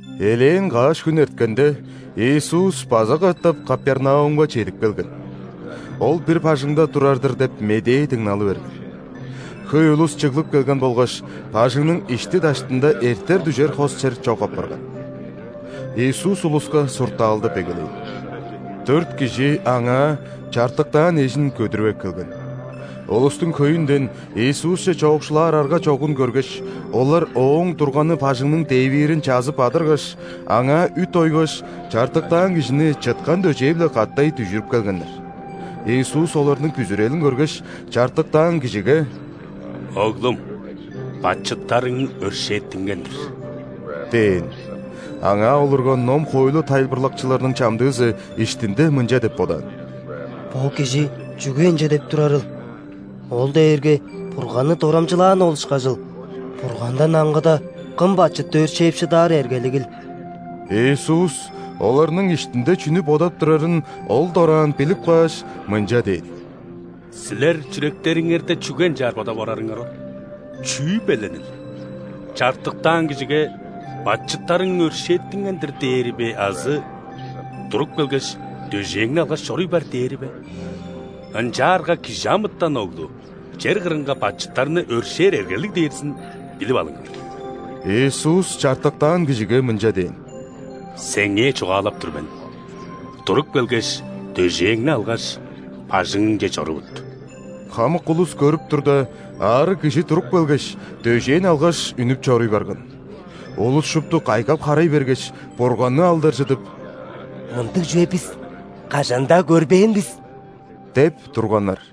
Элээн каш хүн эрткенде, Иисус база катап Капернаумга чедип келген. Ол бир бажыңда турар-дыр деп медээ дыңналы берген. Хөй улус чыглып келген болгаш, бажыңның ишти-даштында эртер-дүжер хос чер чок апарган. Иисус улуска суртаалдап эгелээн. Дөрт кижи Аңаа чартыктаан эжин көдүрүп эккелген. Улустуң хөйүнден Иисусче чоокшулаар арга чогун көргеш, олар Ооң турганы бажыңның дээвиирин чазып-адыргаш, аңаа үт ойгаш, чартыктаан кижини чыткан дөжээ-биле катай дүжүрүп келгеннер. Иисус оларның бүзүрелин көргеш, чартыктаан кижиге: «Оглум! Бачыттарың өршээттинген-дир» – дээн. Аңаа олурган ном-хоойлу тайылбырлакчыларының чамдыызы иштинде мынча деп бодаан: «Бо Кижи чүге ынча деп турарыл? Ол дээрге Бурганны дорамчылааны ол ышкажыл! Бургандан аңгыда кым бачытты өршээп шыдаар эргелигил?» Иисус оларның иштинде чүнү бодап турарын ол дораан билип кааш, мынча дээн: «Силер чүректериңерде чүге ынчаар бодап орарыңар ол? Чүү беленил? Чартыктаан кижиге: „Бачыттарың өршээттинген-дир“ – дээри бе азы: „Туруп келгеш, дөжээңни алгаш, чоруй бар“ – дээри бе? Ынчаарга ·Кижи амытан Оглу чер кырынга бачыттарны өршээр эргелиг дээрзин билип алыңар...» Иисус чартыктаан кижиге мынча дээн: «Сеңээ чугаалап тур мен: туруп келгеш, дөжээңни алгаш, бажыңыңче чорувут». Хамык улус көрүп турда, аарыг кижи туруп келгеш, дөжээн алгаш, үнүп чоруй барган. Улус шупту кайгап-харай бергеш, Бурганны алдаржыдып: «Мындыг чүве бис кажан-даа көрбээн бис!» – деп турганнар.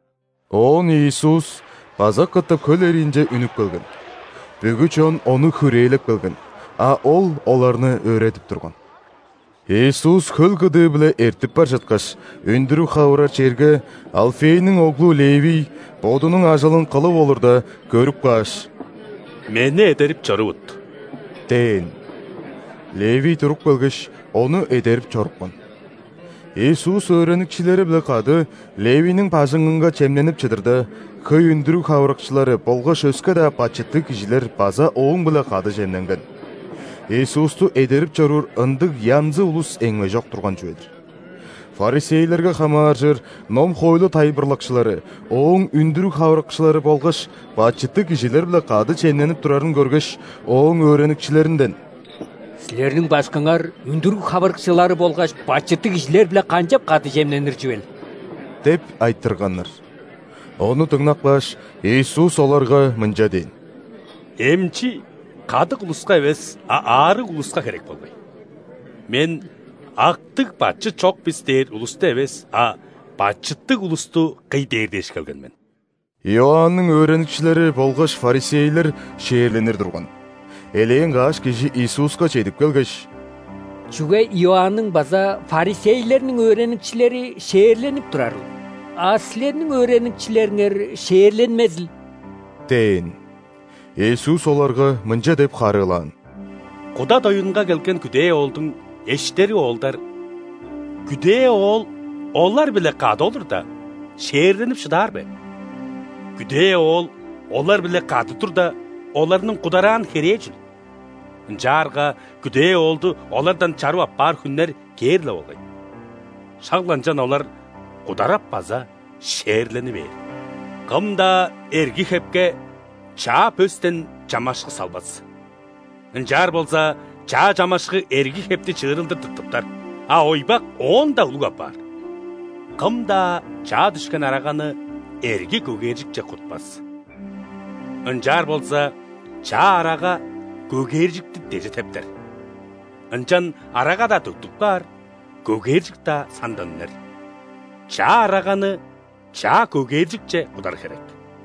Оон Иисус база катап хөл эриинче үнүп келген. Бүгү чон Ону хүрээлеп келген, а Ол оларны өөредип турган. Иисус хөл кыдыы-биле эртип бар чыткаш, үндүрүг хавырар черге Алфейниң оглу Левий бодунуң ажылын кылып олурда, көрүп кааш: «Мени эдерип чорувут» – дээн. Левий туруп келгеш, Ону эдерип чорупкан. Иисус өөреникчилери-биле кады Левийниң бажыңынга чемненип чыдырда, хөй үндүрүг хавырыкчылары болгаш өске-даа бачыттыг кижилер база Ооң-биле кады чемненген. Иисусту эдерип чоруур ындыг янзы улус эңмежок турган чүве-дир. ·Фарисейлерге хамааржыр ном-хоойлу тайылбырлакчылары Ооң үндүрүг хавырыкчылары болгаш бачыттыг кижилер-биле кады чемненип турарын көргеш, Ооң өөреникчилеринден: «Силерниң Башкыңар үндүрүг хавырыкчылары болгаш бачыттыг кижилер-биле канчап кады чемненир чүвел?» – деп айтырганнар. Ону дыңнап кааш, Иисус оларга мынча дээн: «Эмчи кадык улуска эвес, а аарыг улуска херек болгай. Мен „Актыг, бачыт чок бис“ дээр улусту эвес, а бачыттыг улусту кый дээр дээш келген мен!» Иоанның өөреникчилери болгаш ·фарисейлер ·шээрленир турган. Элээн каш кижи Иисуска чедип келгеш: «Чүге Иоанның база фарисейлерниң өөреникчилери шээрленип турарыл, а Силерниң өөреникчилериңер шээрленмезил?» – дээн. Иисус оларга мынча деп харыылаан: «Куда доюнга келген күдээ оолдуң эштери оолдар, күдээ оол олар-биле кады олурда, шээрленип шыдаар бе? Күдээ оол олар-биле кады турда, оларның кудараан херээ чүл? Ынчаарга күдээ оолду олардан чарып аппаар хүннер кээр-ле болгай, шак-ла ынчан олар кударап база шээрлени бээр. Кым-даа эрги хепке чаа пөстен чамашкы салбас. Ынчаар болза, чаа чамашкы эрги хепти чыырылдыр тыртыптар, а ойбак оон-даа улуг апаар. Кым-даа чаа дүшкен араганы эрги көгээржикче кутпас. Ынчаар болза, чаа арага көгээржикти деже тептер, ынчан арага-даа төктүп каар, көгээржик-даа сандан үнер. Чаа араганы чаа көгээржикче кудар херек».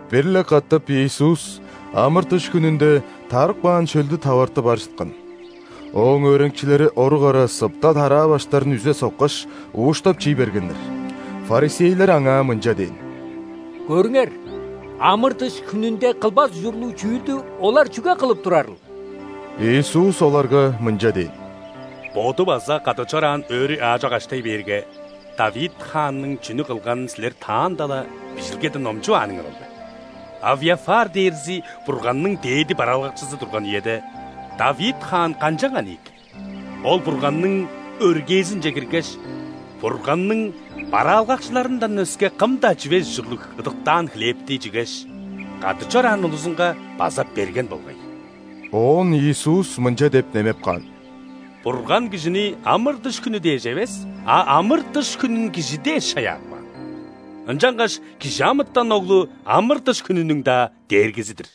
Бир-ле катап Иисус ·амыр-дыш хүнүнде тарып каан шөлдү таварты бар чыткан. Ооң өөреникчилери орук ара сыпта тараа баштарын үзе соккаш, ууштап чий бергеннер. ·Фарисейлер Аңаа мынча дээн: «Көрүңер! Амыр-дыш хүнүнде кылбас ужурлуг чүүлдү олар чүге кылып турарыл?» Иисус оларга мынча дээн: «Боду база кады чораан өөрү аажок аштай бээрге, Давид хаанның чүнү кылганын силер таанда-ла Бижилгеден номчувааныңар ол бе? Авиафар дээрзи Бурганның дээди бараалгакчызы турган үеде, Давид хаан канчанган ийик? Ол Бурганның өргээзинче киргеш, Бурганның бараалгакчыларындан өске кым-даа чивес ужурлуг ыдыктаан хлебти чигеш, кады чораан улузунга база берген болгай». Оон Иисус мынча деп немеп каан: «Бурган кижини амыр-дыш хүнү дээш эвес, а амыр-дыш хүнүн кижи дээш чаяап каан. Ынчангаш ·Кижи амытан Оглу – амыр-дыш хүнүнүң-даа Дээргизи-дир!»